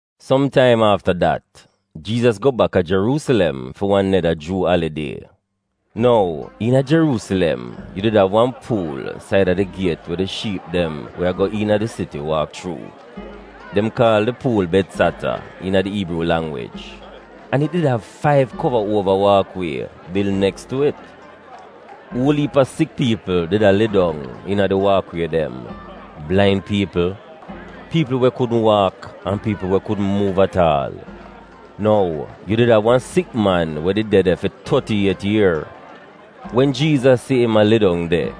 Som taim afta dat, Jiizas go baka Jeruusilem fi wan neda Juu alidie. Nou, iina Jeruusilem, yu did av wan puul saida di giet we di shiip dem we go iina di siti waak chuu. Dem kaal di puul Betzata iina di Iibruu langwij, an it did av faiv kova uova waak wie bil neks tu it. Uol iip a sik piipl did a lai dong iina di waak wie dem — blain piipl, piipl we kudn waak an piipl we kudn muuv at aal. Nou, yu did av wan sik man we did de de fi toti iet ier. Wen Jiizas si im a lai dong de,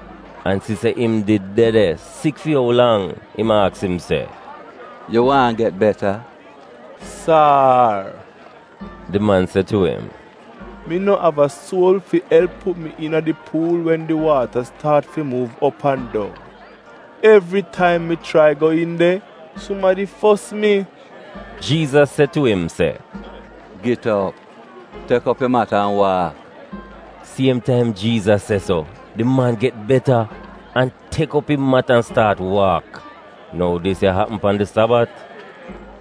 an si se im did de de sik fi ou lang, im aks im se, “Yu waahn get beta?” “Sar,” di man se tu im, “mi no av a suol fi elp put mi iina di puul wen taim di waata staat fi muuv op an dong. Evritaim mi chrai go iin de, sumadi fos mi.” Jiizas se tu im se, “Git op! Tek op yu mat an waak!” Siem taim Jiizas se so, di man get beta, an tek op im mat an staat waak. Nou, dis ya apm pan di Sabat.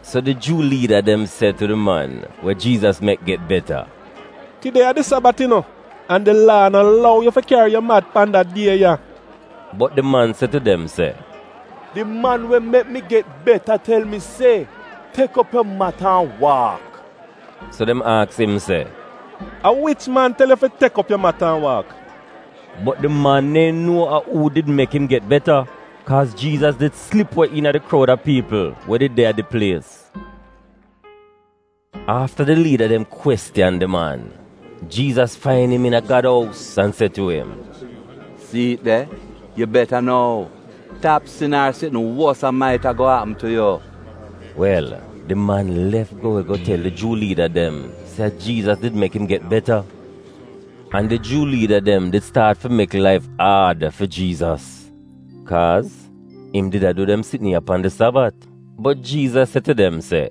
So di Juu liida dem se tu di man we Jiizas mek get beta, “Tide a di Sabat, yu nuo, an di Laa no lou yu fi kyari yu mat pan da die ya.” Bot di man se tu dem se, “Di man we mek mi get beta tel mi se, ‘Tek op yu mat an waak.’” So dem aks im se, “A wich man tel yu fi, tek op mat an waak?” Bot di man neehn nuo a uu did mek im get beta kaaz Jiizas did slip we iina di kroud a piipl we did de a di plies. Afta di liida dem kwestiyan di man, Jiizas fain im iina Gad ous an se tu im, “Si'it de, yu beta nou! Tap sin ar sitn wosa mait-a go apm tu yu.” Wel, di man lef go we go tel di Juu liida dem se a Jiizas did mek im get beta. An di Juu liida dem did staat fi mek laif aad fi Jiizas, kaaz im did a du dem sitn ya pan di Sabat. Bot Jiizas se tu dem se,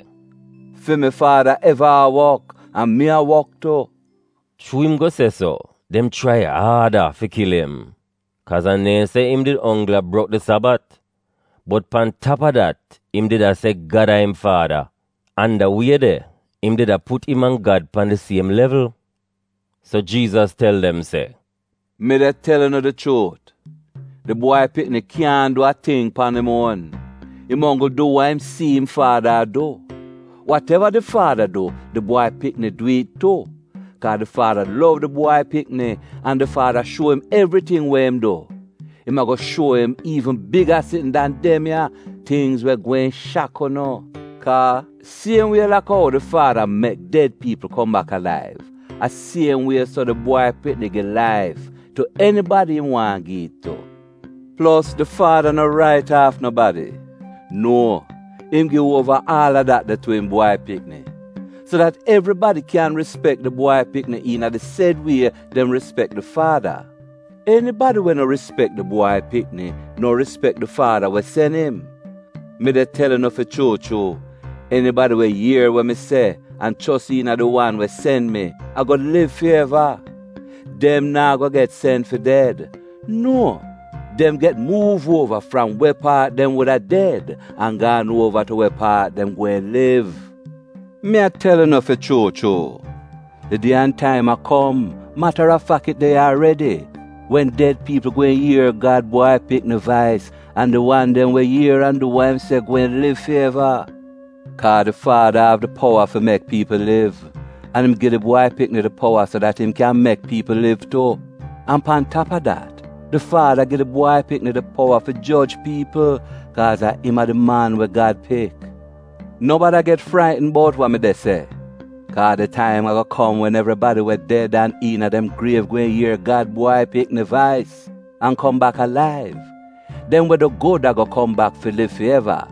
“Fi mi Faada eva a wok, an mi a wok tu.” Chuu im go se so, dem chrai aada fi kil im, kaaz a neehn se im did onggl a brok di Sabat, bot pan tap a dat, im did a se Gad a im Faada, an da wie de, im did a put im an Gad pan di siem levl. So Jiizas tel dem se, “Mi de tel unu di chuut, di Bwai Pikni kyaahn du a ting pan im uon. Im onggl du wa im si'im Faada a du. Wat-eva di Faada du, di Bwai Pikni dwi'it tu. Kaa di Faada lov di Bwai Pikni an di Faada shuo im evriting we im du. Im a-go shuo im iivn biga sitn dan dem ya — tingz we gweehn shak unu. Kaa, siem wie laka ou di Faada mek ded piipl kom bak alaiv, a siem wie so di Bwai Pikni gi laif tu enibadi im waahn gi'it tu. Plos, di Faada no rait aaf nobadi. Nuo! Im gi uova aal a dat de tu im Bwai Pikni, so dat evribadi kyan rispek di Bwai Pikni iina di sed wie dem rispek di Faada. Enibadi we no rispek di Bwai Pikni no rispek di Faada we sen im. “Mi de tel unu fi chuu chuu, enibadi we ier we mi se an chos iina di wan we sen mi, a-go liv fi eva. Dem naa go get sen fi ded. Nuo! Dem get muuv uova fram we paat dem wuda ded, an gaan uova tu we paat dem gweehn liv. “Mi a tel unu fi chuu chuu, di die an taim a kom — matarafak, it de ya aredi — wen ded piipl gweehn ier Gad Bwai Pikni vais an di wan dem we ier an du wa im se gweehn liv fi eva. Kaa di Faada av di powa fi mek piipl liv, an im gi di Bwai Pikni di powa so dat im kyan mek piipl liv tu. An pan tap a dat, di Faada gi di Bwai Pikni di powa fi joj piipl, kaaz a im a di Man we Gad Pik. “No bada get fraitn bout wa mi de se. Kaa di taim a-go kom wen evribadi we ded an iina dem griev gweehn ier Gad Bwai Pikni vais an kom bak alaiv — dem we du gud a-go kom bak fi liv fi eva,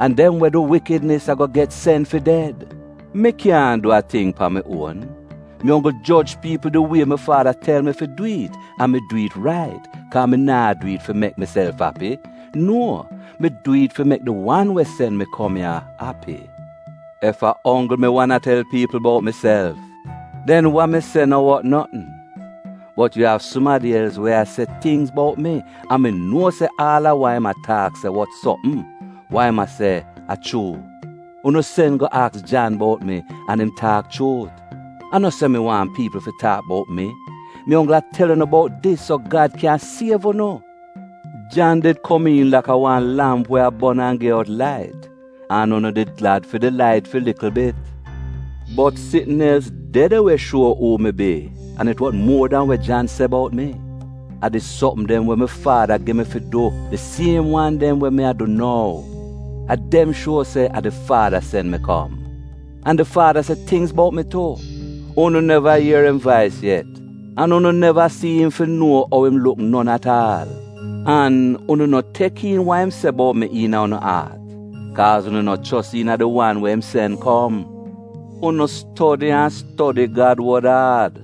an dem we du wikidnis a-go get sen fi ded. Mi kyaahn du a ting pan mi uon. Mi onggl joj piipl di wie mi Faada tel mi fi dwi'it, an mi dwi'it rait, kaa mi naa dwi'it fi mek miself api. Nuo! Mi dwi'it fi mek di wan we sen mi kom ya api. “Ef a onggl mi wan a tel piipl bout miself, den wa mi se no wot notn. Bot yu av sumadi els we a se tingz bout mi, an mi nuo se aal a wa im a taak se wot sopm — wa im se a chuu. Unu sen go aks Jan bout mi an im taak chuut. A no se mi waahn piipl fi taak bout mi. Mi onggl a tel unu bout dis, so Gad kyan siev unu. Jan did komiin laka wan lamp we a bon an gi out lait, an unu did glad fi di lait fi likl bit. “Bot sitn els de de we shuo uu mi bi an it wot muo dan we Jan se bout mi. A di sopm dem we mi Faada gi mi fi du — di siem wan dem we mi a du nou — a dem shuo se a di Faada sen mi kom. An di Faada se tingz bout mi tu. Unu neva ier im vais yet, an unu neva si'im fi nuo ou im luk non at aal. An unu no tek iin wa im se bout mi iina unu aat, kaaz unu no chos iina di wan we im sen kom. Unu stodi an stodi Gad wod aad,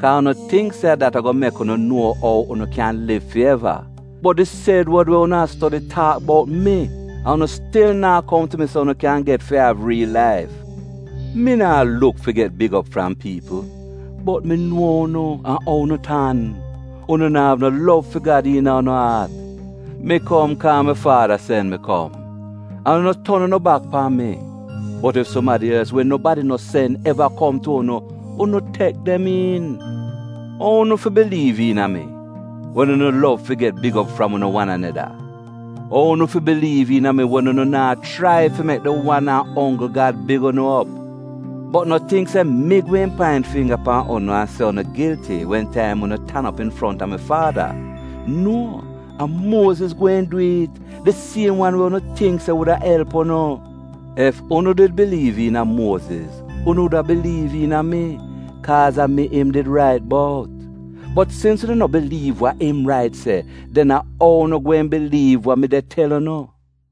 kaa unu tingk se a dat a-go mek unu nuo ou unu kyan liv fi eva. Bot di sed wod we unu a stodi, taak bout mi, an unu stil naa kom tu mi so unu kyan get fi av riil laif. “Mi naa luk fi get big op fram piipl. Bot mi nuo unu an ou unu tan. Unu na'av no lov fi Gad iina unu aat. Mi kom kaa mi faada sen mi kom, an unu ton unu bak pan mi. Bot ef sumadi els we nobadi no sen eva kom tu unu, unu tek dem iin. Ou unu fi biliiv iina mi, wen unu lov fi get big op fram unu wan aneda? Ou unu fi biliiv iina mi, wen unu naa chrai fi mek di wan an onggl Gad big unu op? “Bot no tingk se mi gweehn paint fingga pan unu an se unu gilti wen taim unu tan op infronta mi Faada. Nuo! A Muoziz gweehn dwi'it. Di siem wan we unu tingk se wuda elp unu. Ef unu did biliiv iina Muoziz, unu wuda biliiv iina mi, kaaz a mi im did rait bout. Bot sins unu no biliiv wa im rait se, den a ou unu gweehn biliiv wa mi de tel unu?”